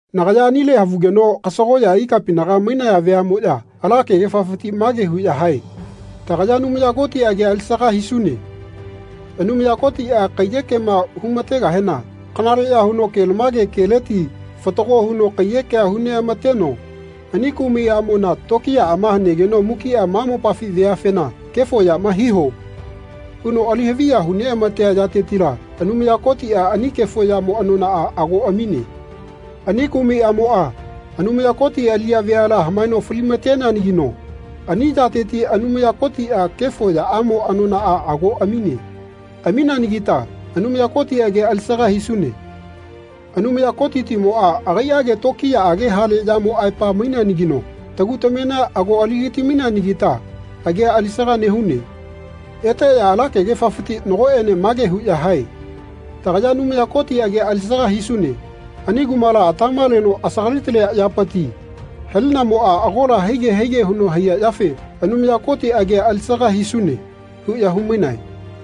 Nagaya anile havugeno kasagoꞌya ikapinaga mainaya veaꞌmoꞌya ala kegefafiti mage huꞌya hae “Tagaya Anumaya Koti agia alisaga hisune. Anumaya Kotiꞌa kaiyekema humategahena kanaleꞌya huno kelamage keleti fatago huno kaiyekea hu neꞌamateno ani kumai aꞌmona tokiyaꞌama hanegeno mukiꞌa ma mopafi veafena ‘Kefo yama hiho.’ huno ali haviya hu neꞌamatea yatetila Anumaya Kotiꞌa ani kefo yamo anonaꞌa ago amine. Ani kumai aꞌmoꞌa Anumaya Koti aliꞌya veala hamaeno falimateneanagino ani yateti Anumaya Kotiꞌa kefo yamaꞌamo anonaꞌa ago amine. Amineanagita Anumaya Koti agia alisaga hisune. Anumaya Kotitimoꞌa agaiꞌage tokiyaꞌage hale yamo aepa maineanagino tagu tamena ago aligati-maineanagita agia alisaga nehune.” Eteꞌya ala kegefaleti nagoꞌene mage huꞌya hae “Tagaya Anumaya Koti agia alisaga hisune. Ani kumala atama leno asagali-talia yapiti halinamoꞌa agola haige haige huno nehaiya yafe Anumaya Koti agia alisaga hisune.” huꞌya humainae.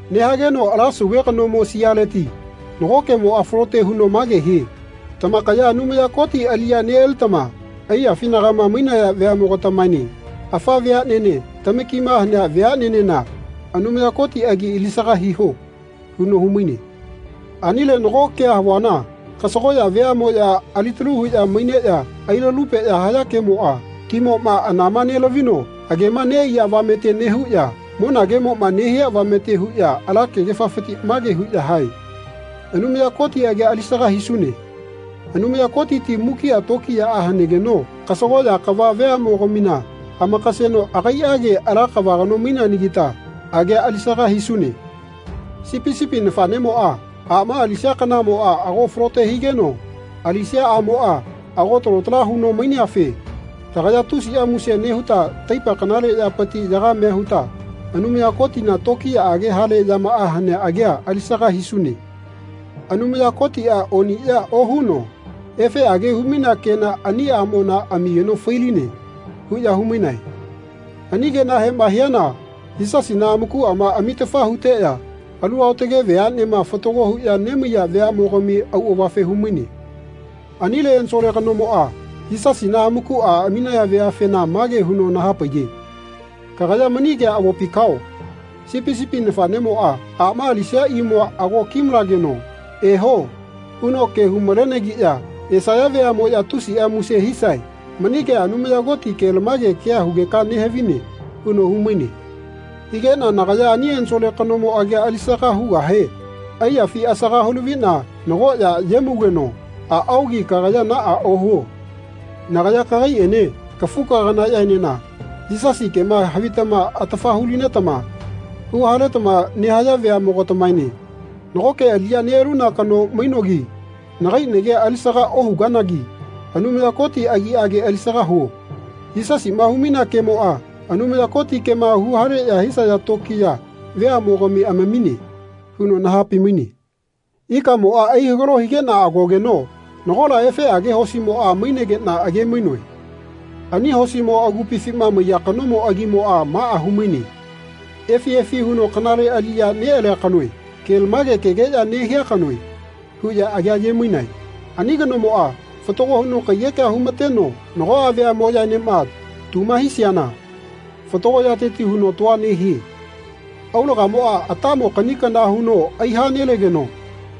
Nehageno ala sauve kanomo sialeti nago kemoꞌa falote huno mage hie “Tamakaya Anumaya Koti aliꞌya neꞌalitama aiyafinagama mainaya veaꞌmogatamaene afa veaꞌnene tamakima hanea veaꞌnenena Anumaya Koti agi alisaga hiho.” huno humaine. Anile nago kea havuana kasagoꞌya veaꞌmoꞌya alitalu huꞌya maineꞌya ailalupeꞌya haya kemoꞌa, timoꞌma anama nelavino agema neꞌaiya avamete nehuꞌya, monagemoꞌma nehia avamete huꞌya ala kegefafiti mage huꞌya hae “Anumaya Koti agia alisaga hisune. Anumaya Kotiti mukiꞌa tokiyaꞌa hanegeno kasagoꞌya kava veaꞌmogamina amakaseno agaiꞌage ala kava kano maineanagita agia alisaga hisune. Sipi sipi nafaꞌnemoꞌa aꞌma alisia kanamoꞌa ago falote higeno alisia aꞌmoꞌa ago talo tala huno maineafe tagaya tusiꞌa muse nehuta taipa kanale yapiti yagamea huta Anumaya Kotina tokiyaꞌage hale yamaꞌa hanea agia alisaga hisune. Anumaya Kotiꞌa oniꞌya ohuno efeꞌage humainea kena ani aꞌmona amigeno fai-line.” huꞌya humainae. Ani kenahema hiana Yisasina amakuꞌama amitafa huteꞌya alu aotage veaꞌnema fatago huꞌya nemaiya veaꞌmogami auꞌavafe humaine. Anile ensole kanomoꞌa Yisasina amakuꞌa aminaya veafena mage huno nahapaiye “Kagaya mani kea avopi kao. ‘Sipi sipi nafaꞌnemoꞌa aꞌma alisia imua ago kimalegeno ‘Ehoꞌ huno ke humalenagiꞌya esaya veaꞌmoꞌya tusiꞌa muse hisae.’ Mani kea Anumaya Koti kelamage kea hugeka nehavine.” huno humaine. Higeꞌna nagaya ani ensole kanomo agia alisaga hugahe aiyafi asaga hulaviꞌna nagoꞌya yemaugeno “Aꞌaogi kagaya naꞌa ohuo. Nagaya kagaiꞌene kafu-kaganaꞌyaenena, Yisasi kema havitama atafa hu-linetama huhaletama nehaya veaꞌmogatamaene nagoke aliꞌya neꞌaluna kano mainogi nagai nagia alisaga ohuganagi Anumaya Koti agiꞌage alisaga huo. Yisasiꞌma humainea kemoꞌa Anumaya Koti kema huhaleꞌya hisaya tokiya veaꞌmogami amamine.” huno nahapai-maine. Ikamoꞌa aihagalo higeꞌna agogeno nagola efeꞌage hosimoꞌa mainegeꞌna age-mainoe. Ani hosimo agupifima maiya kanomo agimoꞌa maꞌa humaine “Efi efi huno kanale aliꞌya neꞌalia kanoe. Kelamage kegeꞌya nehia kanoe.” huꞌya agia aye-mainae. Ani kanomoꞌa fatago huno kaiyekea humateno nagoꞌa veaꞌmoꞌyaenema tuma hisiana fatago yateti huno tua nehie. Aulagamoꞌa atamo kaꞌni kana huno aiha nelegeno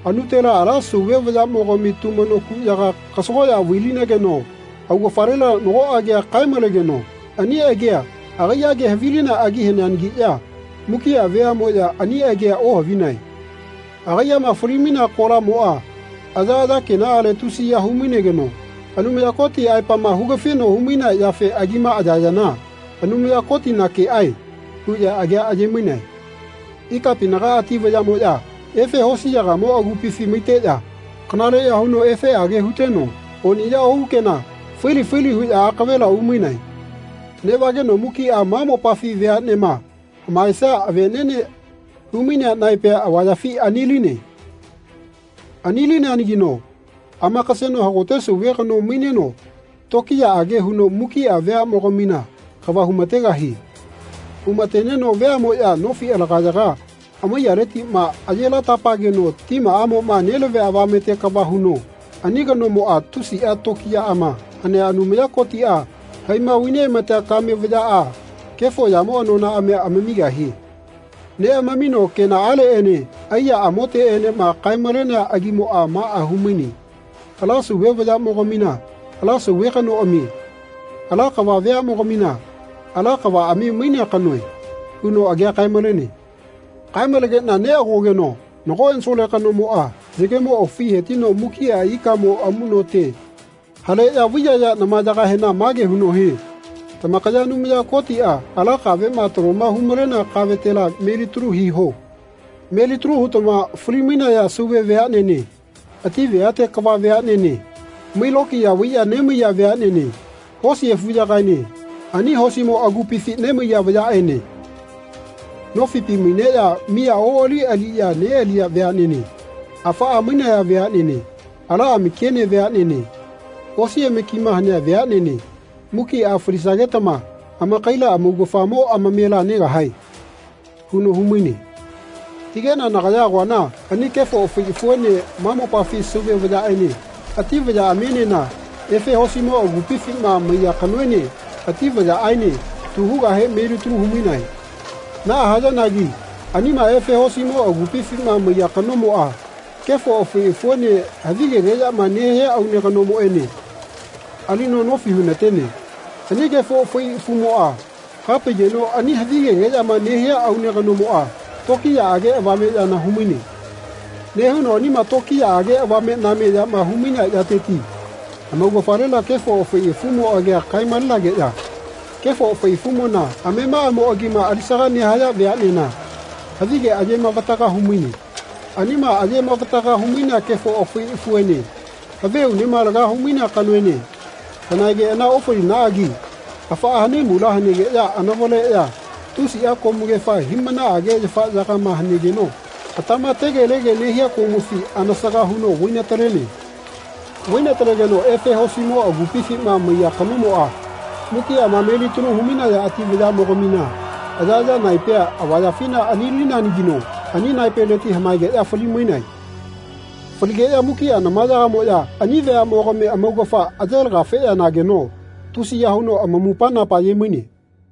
anutela ala Sauve vayaꞌmogami tumano kuꞌyaga kasagoꞌya vai-linegeno augafalela nago agia kae-malegeno ani agia agaiꞌage havilinea agi haneanagiꞌya mukiꞌa veaꞌmoꞌya ani agia ohavinae. Agaiꞌama fai-linea kolamoꞌa ayaꞌaya kenaꞌale tusiya hu-mainegeno Anumaya Koti aepama hugafino humainea yafe agima ayayana “Anumaya Kotina keꞌae.” huꞌya agia ayemainae. Ikapinaga ati vayaꞌmoꞌya efe hosiyagamo agupifi maiteꞌya kanaleꞌya huno efeꞌage huteno oniꞌya ohu kena, faili faili huꞌya akavela umainae. Neꞌvageno mukiꞌa ma mopafi veaꞌnema hamaesia aveꞌneꞌne humainea naepea avayafina aniline. Ani-lineanagino amakaseno hagote Sauve kano maineno tokiyaꞌage huno mukiꞌa veaꞌmogamina kava humategahie. Humateneno veaꞌmoꞌya nofi alagayaga amaiyaletiꞌma aye lata-pageno timaꞌamoꞌma nelavia avamete kava huno ani kanomoꞌa tusiꞌa tokiyaꞌama hanea Anumaya Kotiꞌa haima vai neꞌamatea kame vayaꞌa kefo yamo anonaꞌamia amamigahie. Neꞌamamino kenaꞌaleꞌene aiya amoteꞌenema kae-malenea agimoꞌa maꞌa humaine “Ala Sauve vayaꞌmogamina ala Sauve kanoꞌamie. Ala kava veaꞌmogamina ala kavaꞌami mainea kanoe.” huno agia kae-malene. Kae-malenegeꞌna neꞌagogeno nago ensole kanomoꞌa yagemo aufi hetino mukiꞌa ikamo amuꞌnote haleꞌya vai-yayea namayagahena mage huno hie “Tamakaya Anumaya Kotiꞌa ala kaveꞌma taloma humalea kavetela melitalu hiho. Melitalu hutama fali-mainaya Sauve veaꞌnene ati veate kava veaꞌnene mai-lokiya vaiꞌya nemaiya veaꞌnene hosi afuyagaene ani hosimo agupifi nemaiya vayaꞌene, nofipi maineꞌya miya oꞌali aliꞌya neꞌaliya veaꞌnene afaꞌa mainaya veaꞌnene, ala amakiene veaꞌnene, osi amakima hanea veaꞌnene mukiꞌa falisagetama amakaila amaugafamo amamela negahae.” huno humaine. Higeꞌna nagaya agoana ani kefo afai afuene ma mopafi Sauve vayaꞌene ati vayaꞌamienena efe hosimo agupifima maiya kanoene ati vayaꞌaene tu hugahe melitalu humainae. Naꞌa hayanagi anima efe hosimo agupifima maiya kanomoꞌa kefo afai afuene havigegeꞌyama nehia aune kanoene alino nofi hunatene. Ani kefo afai afumoꞌa hapaigeno ani havigegeꞌyama nehia aune kanomoꞌa tokiyaꞌage avame yana humaine. Nehuno anima tokiyaꞌage avame-name yama humainea yateti amaugafalela kefo afai afumo agia kae-malenageꞌya kefo afai afumona amemaꞌamo agima alisaga nehaya veaꞌnena havige aye mavataga humaine. Anima aye mavatagama humainea kefo afai afuene havi aunema laga humainea kanoene hanaegeꞌana ofalinaꞌagi afaꞌa hanaimula hanegeꞌya anavaleꞌya tusiꞌa komugefa hiꞌmanaꞌage yafaꞌyagama hanegeno atama tegelege nehia komufi anasaga huno vai-talenae. Vai-taleteno efe hosimo agupifima maiya kanomoꞌa mukiꞌama melitalu humainaya ati vayaꞌmogamina ayaꞌaya naipea avayafina ani-lineanagino ani naipeleti hamaegeꞌya fali-mainae. Faligeꞌya mukiꞌa namayagamoꞌya ani veaꞌmogami amaugafa aye laga-feꞌya nageno tusiya huno amamupa-napa ayemaine.